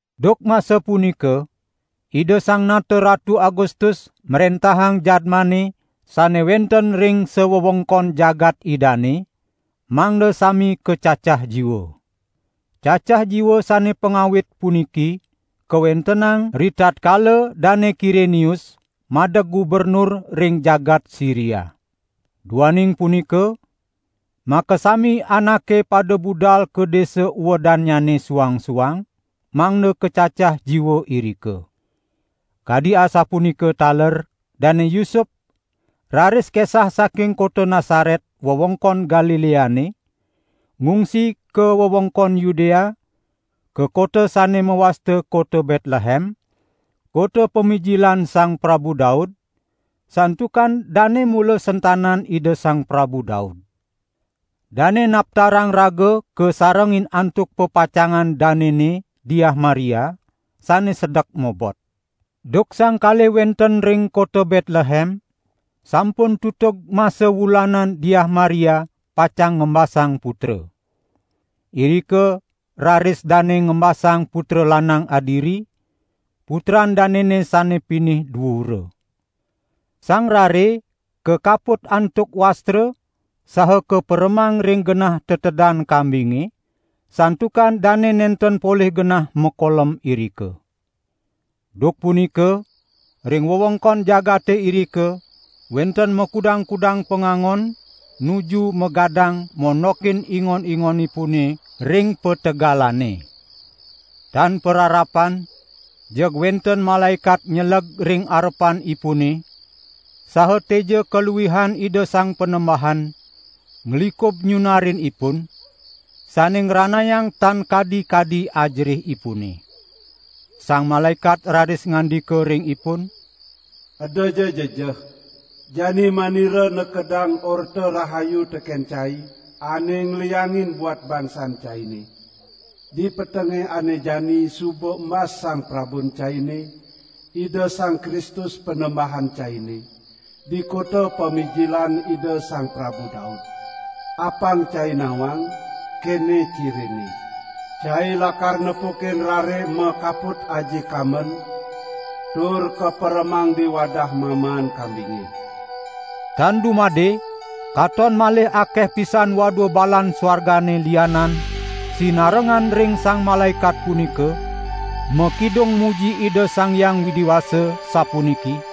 Duk masa punika Ida Sang Nata Ratu Agustus mrentahang jadmane sane wenten ring sawewengkon jagat idane, mangda sami kacacah jiwa. Cacah jiwa sane pangawit puniki kawentenang ritatkala Dane Kirenius madeg gubernur ring jagat Siria. Duaning punika, makasami anake pada budal ka desa uedannyane suang-suang, mangda kacacah jiwa irika. Kadi asapunika taler Dane Yusup raris kesah saking kota Nasaret wewengkon Galileane, ngungsi ka wewengkon Yudea, ka kota sane mawasta kota Betlehem, kota pamijilan Sang Prabu Daud, santukan dane mula sentanan Ida Sang Prabu Daud. Dane naptarang raga kasarengin antuk pepacangan danene Diah Maria, sane sedek mobot. Duk sang kalih wenten ring kota Betlehem, sampun tutug masa wulanan Diah Maria pacang ngembasang putra. Irika raris dane ngembasang putra lanang adiri, putran danene sane pinih duura. Sang rare kakaput antuk wastra saha kaperemang ring genah tetedan kambinge, santukan dane nenten polih genah makolem irika. Duk punika ring wewengkon jagate irika wenten makudang-kudang pangangon nuju magadang mondokin ingon-ingonipune ring pategalane. Tan pararapan jeg wenten malaekat nyeleg ring arepanipune, saha teja kaluihan Ida Sang Panembahan nglikub nyunarin ipun, sane ngranayang tan kadi-kadi ajerihipune. Sang malaekat raris ngandika ring ipun: "Edaja jejeh! Jani manira nekedang Orta Rahayu teken cai ane ngliangin buat bangsan caine. Di petenge ane jani suba embas Sang Prabun caine, Ida Sang Kristus Panembahan caine, di kota pamijilan Ida Sang Prabu Daud. Apang cai nawang, kene cirinne: cai lakar nepukin Rare makaput aji kamben tur kaperemang di wadah mamaan kambinge." Tan dumade katon malih akeh pisan wadua balan suargane lianan sinarengan ring sang malaekat punika, makidung muji Ida Sang Hyang Widi Wasa, sapuniki: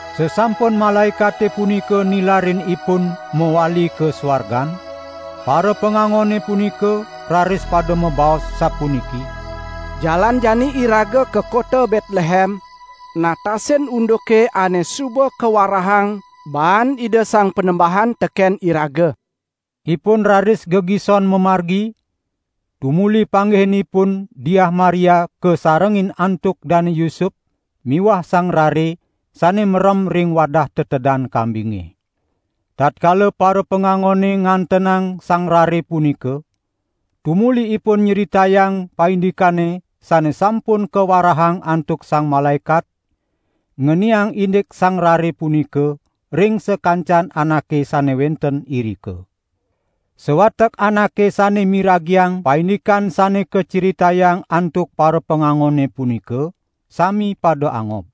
Sasampun malaekate punika nilarin ipun mawali ka suargan, parapangangone punika raris pada mabaos sapuniki: "Jalan jani iraga ka kota Betlehem, natasin unduke ane suba kawarahang baan Ida Sang Panembahan teken iraga." Ipun raris gegison mamargi, tumuli panggihin ipun Diah Maria kasarengin antuk Dane Yusup miwah Sang Rare sane merem ring wadah tetedan kambinge. Tatkala parapangangone ngantenang Sang Rare punika, tumuli ipun nyritayang paindikane sane sampun kawarahang antuk sang malaekat ngeniang indik Sang Rare punika ring sakancan anake sane wenten irika. Sawatek anake sane miragiang paindikan sane kacritayang antuk parapangangone punika, sami pada angob.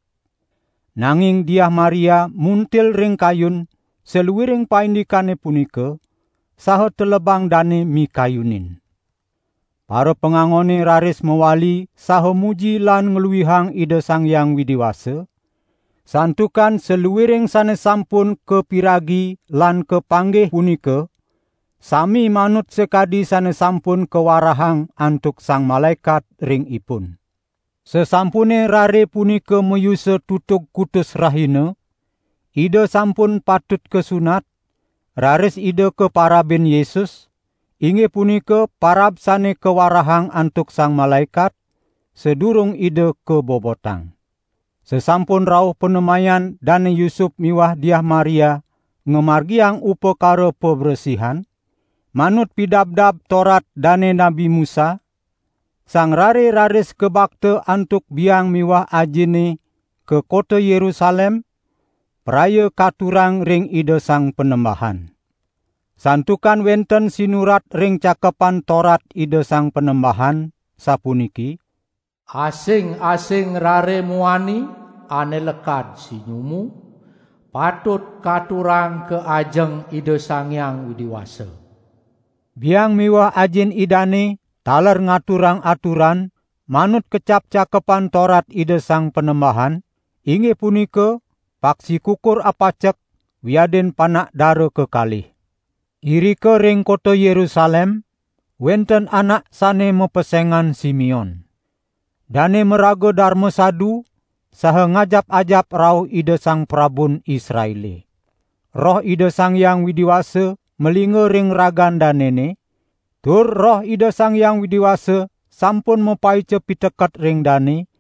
Nanging Diah Maria muntil ring kayun saluiring paindikane punika, saha telebang dane mikayunin. Parapangangone raris mawali saha muji lan ngluihang Ida Sang Hyang Widi Wasa, santukan saluiring sane sampun kapiragi lan kapanggih punika sami manut sakadi sane sampun kawarahang antuk sang malaekat ring ipun. Sasampune Rare punika mayusa tutug kutus rahina, Ida sampun patut kasunat, raris Ida kaparabin Yesus, inggih punika parab sane kawarahang antuk sang malaekat, sadurung Ida kabobotang. Sasampun rauh panemayan Dane Yusup miwah Diah Maria ngamargiang upakara pabresihan, manut pidabdab Torat dane Nabi Musa, Sang Rare raris kabakta antuk biang miwah ajine ka kota Yerusalem, praya katurang ring Ida Sang Panembahan. Santukan wenten sinurat ring Cakepan Torat Ida Sang Panembahan, sapuniki: "Asing-asing rare muani ane lekad sinyumu, patut katurang ka ajeng Ida Sang Hyang Widi Wasa." Biang miwah ajin Idane taler ngaturang aturan, manut kecap Cakepan Torat Ida Sang Panembahan, inggih punika paksi kukur apacek wiadin panak dara kekalih. Irika ring kota Yerusalem wenten anak sane mapesengan Simeon. Dane maraga darma sadu saha ngajap-ajap rauh Ida Sang Prabun Israele. Roh Ida Sang Hyang Widi Wasa malingga ring ragan danene, tur Roh Ida Sang Hyang Widi Wasa sampun mapaica piteket ring dane,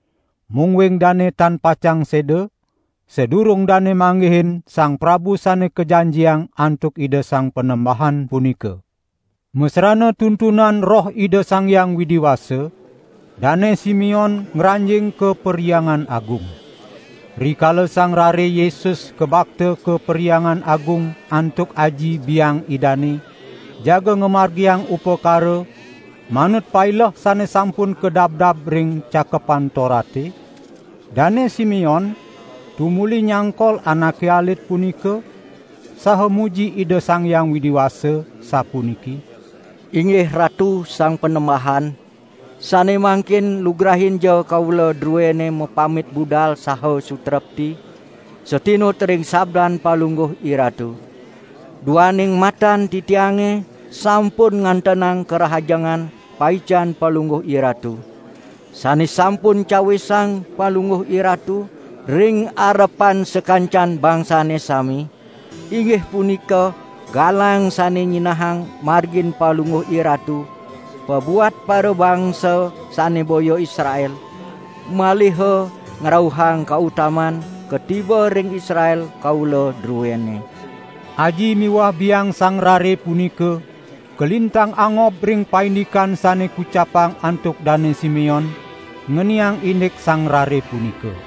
mungguing dane tan pacang seda, sadurung dane manggihin Sang Prabu Sane Kajanjiang antuk Ida Sang Panembahan punika. Masrana tuntunan Roh Ida Sang Hyang Widi Wasa, Dane Simeon ngranjing ka Perhyangan Agung. Rikala Sang Rare Yesus kabakta ka Perhyangan Agung antuk aji biang Idane jaga ngamargiang upakara manut paileh sane sampun kadabdab ring Cakepan Torate, Dane Simeon tumuli nyangkol Anake Alit punika saha muji Ida Sang Hyang Widi Wasa sapuniki: "Inggih Ratu Sang Panembahan, sane mangkin lugrainja kaula druene mapamit budal saha sutrepti, satinut ring sabdan Palungguh IRatu, duaning matan titiange sampun ngantenang karahajengan paican Palungguh IRatu, sane sampun cawisang Palungguh IRatu ring arepan sakancan bangsane sami, inggih punika galang sane nyinahang margin Palungguh IRatu pabuat parabangsa sane boya Israel, maliha ngrauhang kautamaan katiba ring Israel kaula druene." Aji miwah biang Sang Rare punika kalintang angob ring paindikan sane kucapang antuk Dane Simeon ngeniang indik Sang Rare punika.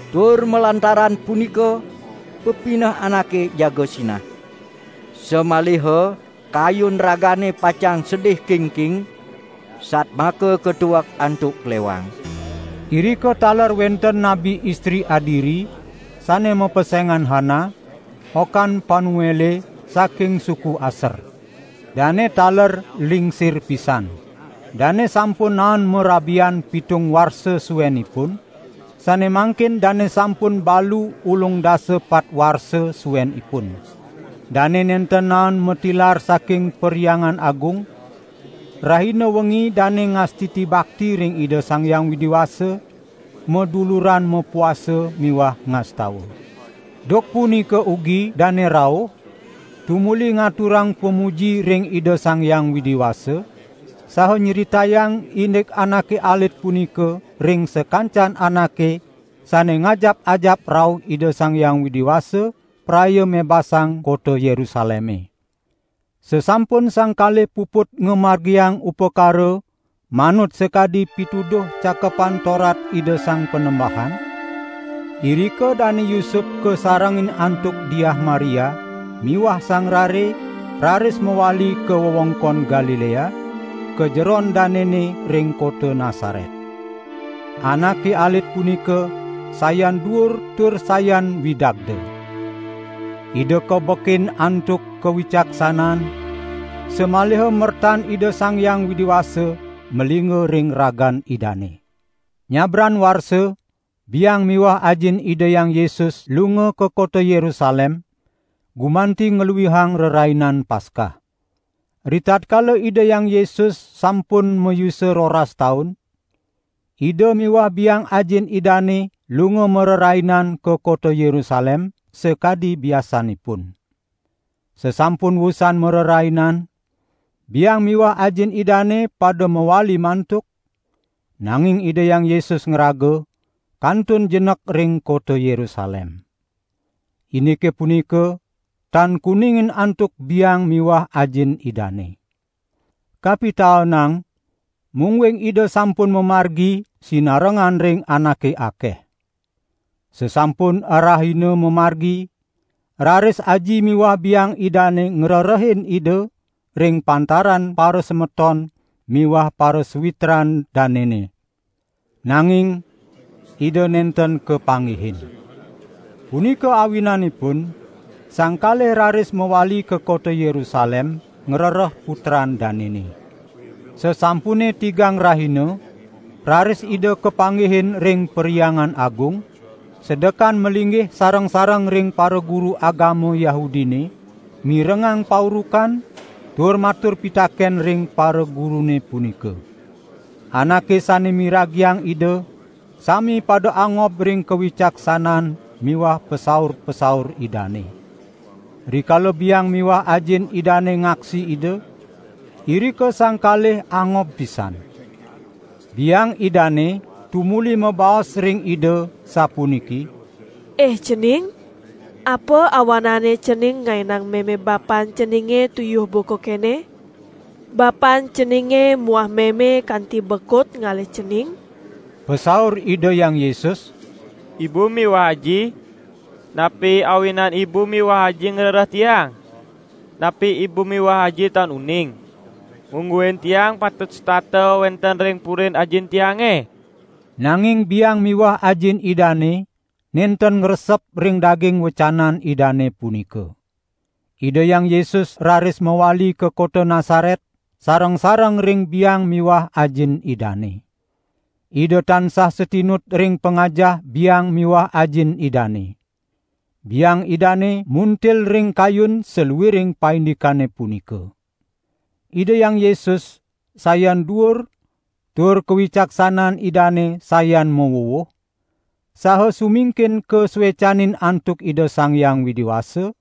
tur malantaran punika pepineh anake jaga sinah. Samaliha kayun ragane pacang sedih kingking, satmaka katuek antuk klewang." Irika taler wenten nabi istri adiri, sane mapesengan Hana, okan Panuele saking suku Aser. Dane taler lingsir pisan. Dane sampun naen marabian pitung warsa suenipun, sane mangkin dane sampun balu ulung dasa patpat warsa suenipun. Dane nenten naen matilar saking Perhyangan Agung; rahina wengi dane ngastiti bakti ring Ida Sang Hyang Widi Wasa, maduluran mapuasa miwah ngastawa. Duk punika ugi dane rauh, tumuli ngaturang pamuji ring Ida Sang Hyang Widi Wasa, saha nyritayang indik Anake Alit punika ring sakancan anake sane ngajap-ajap rauh Ida Sang Hyang Widi Wasa praya mebasang kota Yerusaleme. Sasampun sang kalih puput ngamargiang upakara manut sakadi pituduh Cakepan Torat Ida Sang Panembahan, irika Dane Yusup kasarengin antuk Diah Maria miwah Sang Rare raris mawali ka wewengkon Galilea ka jeron danene ring kota Nasaret. Anake Alit punika sayan duur tur sayan widagda. Ida kabekin antuk kawicaksanaan, samaliha mertan Ida Sang Hyang Widi Wasa malingga ring ragan Idane. Nyabran warsa biang miwah ajin Ida Hyang Yesus lunga ka kota Yerusalem, gumanti ngluihang Rerainan Paskah. Ritatkala Ida Hyang Yesus sampun mayusa roras taun, Ida miwah biang ajin Idane lunga marerainan ka kota Yerusalem, sakadi biasanipun. Sasampun wusan marerainan biang miwah ajin Idane pada mawali mantuk, nanging Ida Hyang Yesus ngraga kantun jenek ring kota Yerusalem. Indike punika tan kuningin antuk biang miwah ajin Idane. Kapitaenang mungguing Ida sampun mamargi sinarengan ring anake akeh. Sasampun arahina mamargi raris aji miwah biang Idane ngrerehin Ida ring pantaran parasemeton miwah parasawitran danene. Nanging Ida nenten kapanggihin. Punika awinanipun sang kalih raris mawali ka kota Yerusalem ngrereh Putran danene. Sasampune tigang rahina raris Ida kapanggihin ring Perhyangan Agung, sedekan malinggih sareng-sareng ring paraguru agama Yahudine, mirengang paurukan tur matur pitaken ring paragurune punika. Anake sane miragiang Ida sami pada angob ring kawicaksanaan miwah pasaur-pasaur Idane. Rikala biang miwah ajin Idane ngaksi Ida, irika sang kalih angob pisan. Biang Idane tumuli mabaos ring Ida sapuniki: "Ih Cening, apa awanane Cening ngaenang meme bapan Ceninge tuyuh buka kene? Bapan Ceninge muah meme kanti bekut ngalih Cening." Pasaur Ida Hyang Yesus: "Ibu miwah aji, napi awinan ibu miwah aji ngrereh Tiang? Napi ibu miwah aji tan uning, mungguing Tiang patut setata wenten ring purin Ajin Tiange?" Nanging biang miwah ajin Idane nenten ngresep ring daging wecanan Idane punika. Ida Hyang Yesus raris mawali ka kota Nasaret sareng-sareng ring biang miwah ajin Idane. Ida tansah satinut ring pangajah biang miwah ajin Idane. Biang Idane muntil ring kayun saluiring paindikane punika. Ida Hyang Yesus sayan duur tur kawicaksanaan Idane sayan mawuwuh, saha sumingkin kasuecanin antuk Ida Sang Hyang Widi Wasa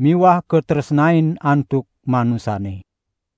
miwah katresnain antuk manusane.